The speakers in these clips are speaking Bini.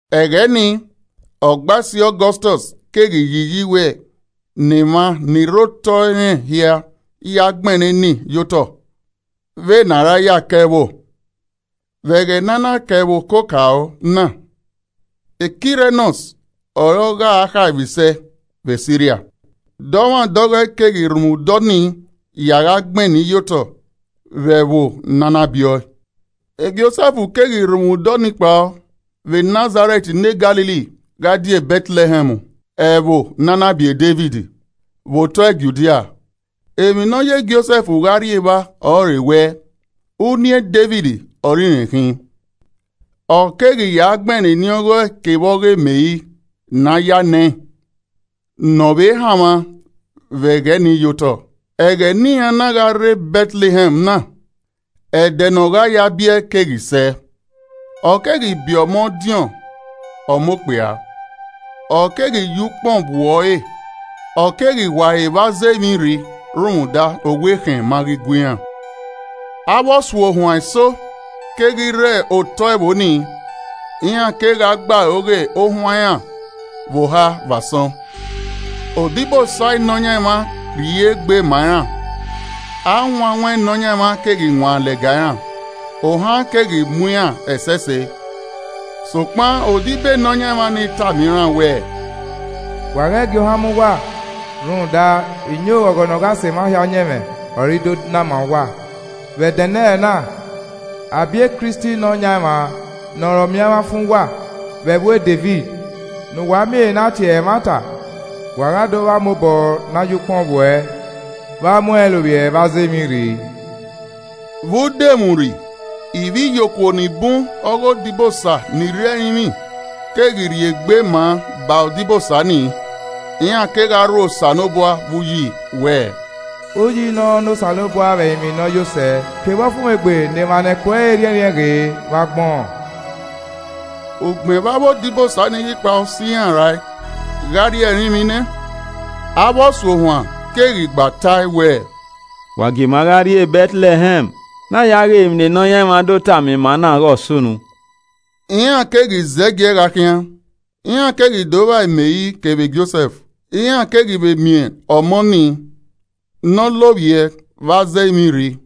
Ẹghẹ nii, Ọgbaisi Ọgọstọs keghi yi iyi wẹ ne emwa ni rre otọe irẹn hia ya gbẹnnẹ eni ye otọ vbene a ra ya ka ẹvbo. Vbe ẹghẹ ne a na ka ẹvbo okokaro na, Kirenios ọre ọ gha khaemwisẹ vbe Siria. Dọmwadẹ ọghọe keghi rhunmwuda ọnii ya gha gbẹn eni ye otọ vbe ẹvbo ne a na bie ọe. Josẹf keghi rhunmwuda ọnii kpao vbe Nazarẹt ne Galili gha die Bẹtlẹhẹm ẹvbo ne a na biẹ Devid, vbe otọe Judia. Emwi nọ ye Josẹf gha rrie evba ọrọre wẹ, uniẹn Devid ọre irẹn khin. Ọ keghi ya gbẹnnẹ eni ọghọe kevbe ọghe Meri ne a ya nẹẹn ne ọ vbe hanmwa vbe ẹghẹ ni ye otọ. Ẹghẹ ne iran na gha rre Bẹtlẹhẹm na, ẹdẹ ne ọ gha ya biẹ keghi sẹ. Ọ keghi biẹ ọmọ ọdiọn ọmọ okpia, ọ keghi ye ukpọn vbuẹ uẹ ọre ọ keghi wa ẹre vbe aza emwirri rhunmwuda owa ekhẹn ma ghi gua iran. Avbe Ọsuohuan eso keghi rre otọe ẹvbo nii, iran kegha gbe aro ghe ohuan iran vbe oha vbe asọn. Odibosa e Nọyaẹnmwa rhie egbe ma iran, awanwan Nọyaẹnmwa keghi wan lẹga iran, ohan keghi mu iran ẹsẹse. Sokpan odibo e Nọyaẹnmwa ni tama iran wẹẹ, “Wa ghẹ gie ohan mu uwa rhunmwuda iyẹn oghọghọ ne ọ gha sẹ emwa hia ọyẹnmwẹ, ọre I do na ma uwa. Vbe ẹdẹnẹrẹ na, a biẹ Kristi Nọyaẹnmwa ne ọre Ọmiọnmwafan uwa, vbe ẹvbo Devid. Ne uwa miẹn ehe ne tie ẹre ẹmwata, wa gha do vba ọmọ obọ ne a ye ukpọn vbuẹ vbe a mu ẹn lovbiẹ vbe aza emwirri.” Vbe udomwurri, ivbiyokuo ni bun ọghe odibosa ni rre ẹrinmwi keghi rhie egbe ma ba odibosa nii, iran kegha rho Osanobua vbe uyi wẹẹ: “Uyi nọ ne Osanobua vbe ẹrinmwi ne ọ yo sẹ. Kevbe ọfumwegbe ne emwa ne ẹko ẹre rhiẹnrhiẹn ghe vbe agbọn!” Ugbẹn vbe avbe odibosa ni ghi kpao sẹ iran rae gha rrie ẹrinmwi nẹ, avbe ọsuohuan keghi gba tae wẹẹ, “Wa gie ima gha rrie Bẹtlẹhẹm ne a ya ghe emwi ne Nọyaẹnmwa do tama ima na ighe ọ sunu.” Iran keghi zẹgiẹ gha khian, iran keghi do vba Meri kevbe Josẹf, iran keghi vbe miẹn ọmọ nii ne ọ lovbiẹ vbe aza emwirri.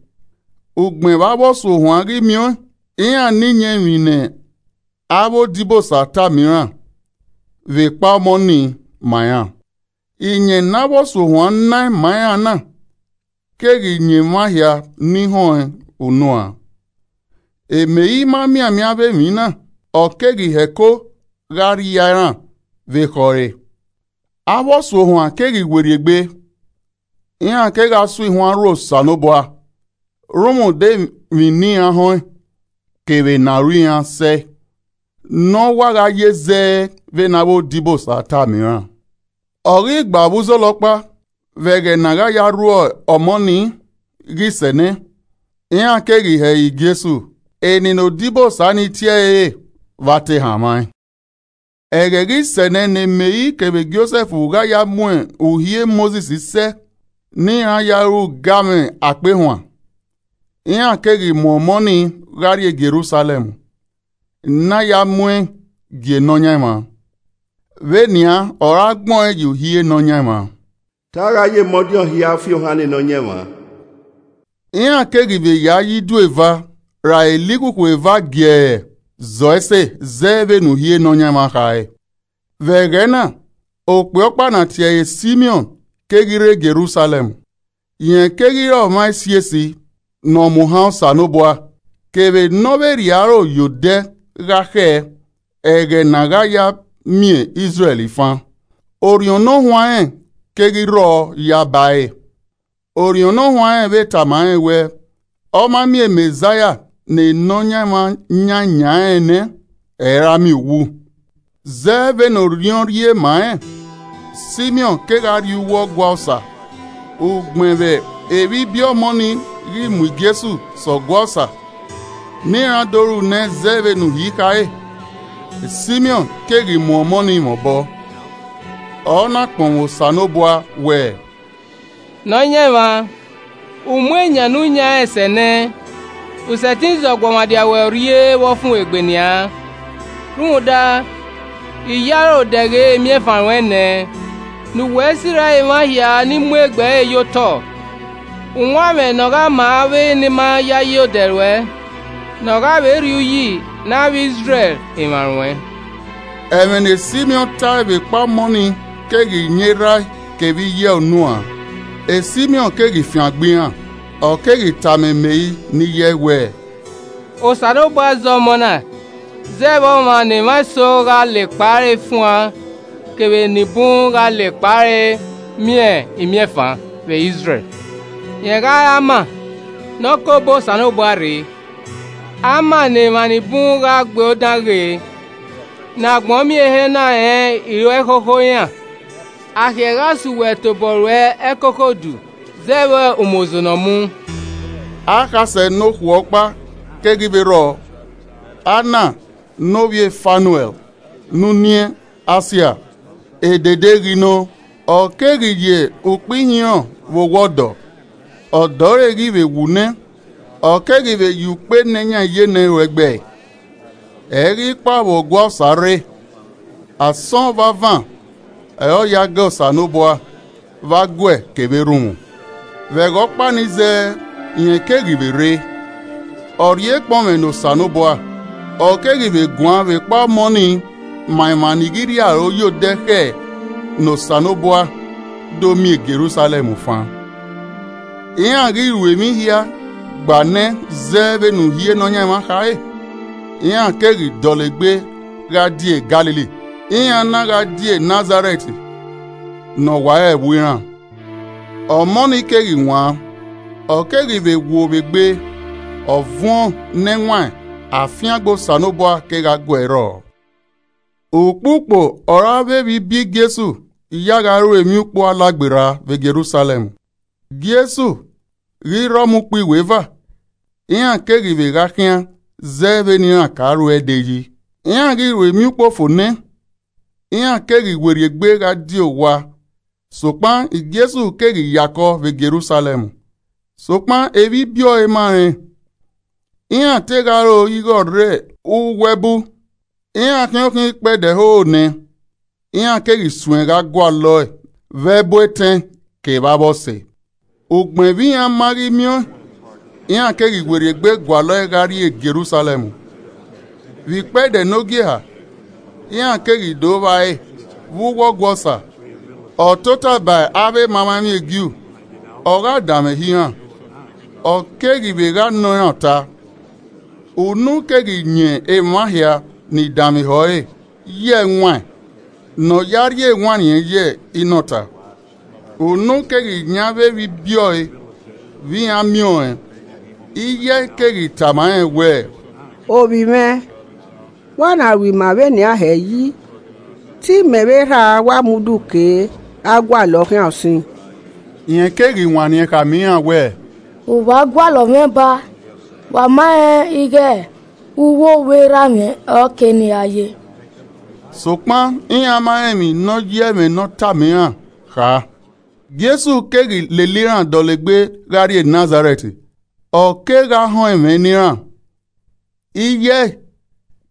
Ugbẹn vbe avbe Ọsuohuan ghi miẹn ọẹn, iran na iyẹn emwi ne avbe odibosa tama iran vbe ekpa ọmọ nii ma iran. Iyẹn ne avbe Ọsuohuan naẹn ma iran na keghi yan emwa hia ni họn ẹn unuan. Meri ma mianmian avbe emwi na, ọ keghi hẹko gha rria iran vbe ekhọe ẹre. Avbe Ọsuohuan keghi werriegbe, iran kegha so ihuan rho Osanobua rhunmwuda emwi ne iran họn ẹn kevbe ne aro iran sẹe ne ọ wa gha ye zẹ vbene avbe odibosa tama iran. Ọ ghi gba vbe uzọla ọkpa, vbe ẹghẹ ne a gha ya rhuẹ ọmọ nii ghi sẹ nẹ, iran keghi he ẹre Jesu, eni ne odibosa ni tie ẹre re vbe a te hanmwa ẹn. Ẹghẹ ghi sẹ nẹ ne Meri kevbe Josẹf gha ya mu Uhi Mosis sẹ ne iran ya ru ugamwẹ akpehuan, iran keghi mu ọmọ ni gha rrie Jerusalẹm ne a ya mu ẹn gie Nọyaẹnmwa. Vbenian ọre agbẹn ọẹn ye uhi Nọyaẹnmwa, “Te a gha ye emọdiọn hia fiohan ne Nọyaẹnmwa.” Iran keghi vbe ya ye idu eva ra elikhukhu eva giẹrẹ zọ ese zẹ vbene uhi Nọyaẹnmwa kha re. Vbe ẹghẹ na, okpia ọkpa ne a tie ẹre Simiọn keghi rre Jerusalẹm. Rẹn keghi re ọmwa esiesi ne ọ mu ohan Osanobua kevbe ne ọ vbe rhie aro ye odẹ gha khẹ ẹghẹ ne a gha ya miẹn Izrẹl fan, orhiọn Ne ọ huanrẹn keghi rrọọ yaba ẹre. Orhiọn Ne Ọ Huanrẹn vbe tama rẹn wẹẹ ọ ma miẹn Mẹzaia ne Nọyaẹnmwa yan eyan rẹn nẹ, ẹ i ra miẹn uwu. Zẹ vbe ne Orhiọn rhie ma rẹn, Simiọn kegha rrie uwu Ọgua Osa. Ugbẹn vbe evbibiẹ ọmọ ni ghi mu Jesu sẹ Ọgua Osa ne iran do ru nẹ zẹ vbene Uhi khare. Simiọn keghi mu ọmọ nii mwẹ obọ, ọ na kpọnmwẹ Osanobua wẹẹ: “Nọyaẹnmwa, u mu eyan ne u yan rẹn sẹ nẹ. U sẹtin zẹ ọguọmwadia ruẹ urrie vbe ọfumwegbe nian. Rhunmwuda, I ye aro dẹghe imiẹnfan ruẹn nẹ. Ne uwẹ sirra emwa hia ni mu egbe ẹre ye otọ. Uwanmwẹ ne ọ gha ma avbe ni ma yayi odẹ ruẹ, ne ọ gha vbe rhie uyi ne avbe Izrẹl emwa ruẹn.” Ẹmwẹ ne Simiọn tae vbekpa ọmọ nii keghi yan erha ẹe kevbe iye ẹe unuan. Simiọn keghi fiangbe iran, ọ keghi tama Meri ne iye ẹe wẹẹ, “Osanobua zẹ ọmọ na zẹ vbe ọmwa ne emwa eso gha la ekpa ẹre fuan kevbe ne enibun gha la ekpa ẹre miẹn imiẹnfan vbe Izrẹl. Rẹn gha re ama ne ọ ke obọ Osanobua rre, ama ne emwa ni bun gha gbe odan ghe. Ne agbọn miẹn ehe na rẹn iro ẹkhokho iran. Akhiẹ gha so uwẹ tobọ ruẹ ẹkoko udu zẹ vbe umozo ne ọ mu.” Akhasẹ nokhuo ọkpa keghi vbe rrọọ, Anna ne ovbi e Fanuẹl ne uniẹn Asia. Edede ghi nọ, ọ keghi ye ukpo ihinrọn vbe owa ọdọ. Ọdọ re ghi vbe wu nẹ, ọ keghi vbe ya ukpo enẹ yan iyenẹ ru ẹgbẹ. Ẹ ghi kpao vbe Ọgua Osa rre. Asọn vbe avan ọre ọ ya ga Osanobua vbe aguẹ kevbe erhunmwu. Vbe ẹghẹ ọkpa nii zẹẹ, rẹn keghi vbe rre, ọ rhie ekpọnmwẹ ne Osanobua, ọ keghi vbe guan vbekpa ọmọ ni ma emwa ni ghi rhie aro ye odẹ khẹ ne Osanobua, do miẹn Jerusalẹm fan. Iran ghi ru emwi hia gba nẹ zẹ vbene Uhi Nọyaẹnmwa khare, iran keghi dọlegbe gha die Galili, iran na gha die Nazarẹt ne ọ wa re ẹvbo iran. Ọmọ ni keghi wan, ọ keghi vbe wo vbe egbe, ọ vuọn ne ẹwaẹn, afiangbe Osanobua kegha gu ẹe rrọọ. Ukpukpo ọre avbe evbibiẹ Jesu ya gha ru Emwiukpo Alagberra vbe Jerusalẹm. Jesu ghi rre ọmọ ukpo iweva, iran keghi vbe gha khian zẹ vbe ne iran ka ruẹe de yi. Iran ghi ru Emwiukpo fo nẹ, iran keghi werriegbe gha die owa sokpan Jesu keghi ya kọ vbe Jerusalẹm, sokpan evbibiẹ ọe ma rẹn. Iran te gha ro ighẹ ọ rre uwu ẹbu, iran khian okhian ikpẹdẹ hoho nẹ, iran keghi suẹn gha gualọ ẹe vbe ẹbu etẹn kevbe avbe ọse. Ugbẹn vbe iran ma ghi miẹn ọẹn, iran keghi werriegbe gualọ ẹe gha rrie Jerusalẹm. Vbe ikpẹdẹ nogieha, iran keghi do vba ẹre vbe uwu Ọgua Osa, ọ tota ba avbe emamwaemwi e Ju, ogha danmwehọ iran, ọ keghi vbe gha nọ iran ọta. Unu keghi yan emwa hia ni danmwehọ ẹre ye ẹwaẹn ne ọ ya rhie ewanniẹn ye inọta. Unu keghi yan avbe evbibiẹ ọe vbe iran miẹn ọẹn, iye ẹe keghi tama rẹn wẹẹ, “Ovbi mwẹ, vbe ua na ru ima vbe nian hẹ yi? Te imẹ vbe erha a wa mu udu kee gha gualọ ọ khian usin.” Rẹn keghi wanniẹn khama iran wẹẹ, “Vbe uwa gualọ mwẹ baa? Wa ma rẹn ighẹ uwowa erha mwẹ ọre ọ kere ne I gha ye.” Sokpan iran ma rẹn emwi ne ọ ya ẹmwẹ ne ọ tama iran kha. Jesu keghi lele iran dọlegbe gha rrie Nazarẹt, ọ kegha họn ẹmwẹ ne iran. Iye ẹe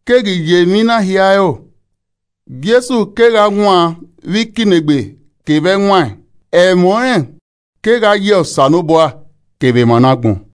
keghi ye emwi na hia ẹro. Jesu kegha wan vbe ikinnegbe kevbe ẹwaẹn, ẹmwẹ ọnrẹn kegha yẹ Osanobua kevbe emwa ne agbọn.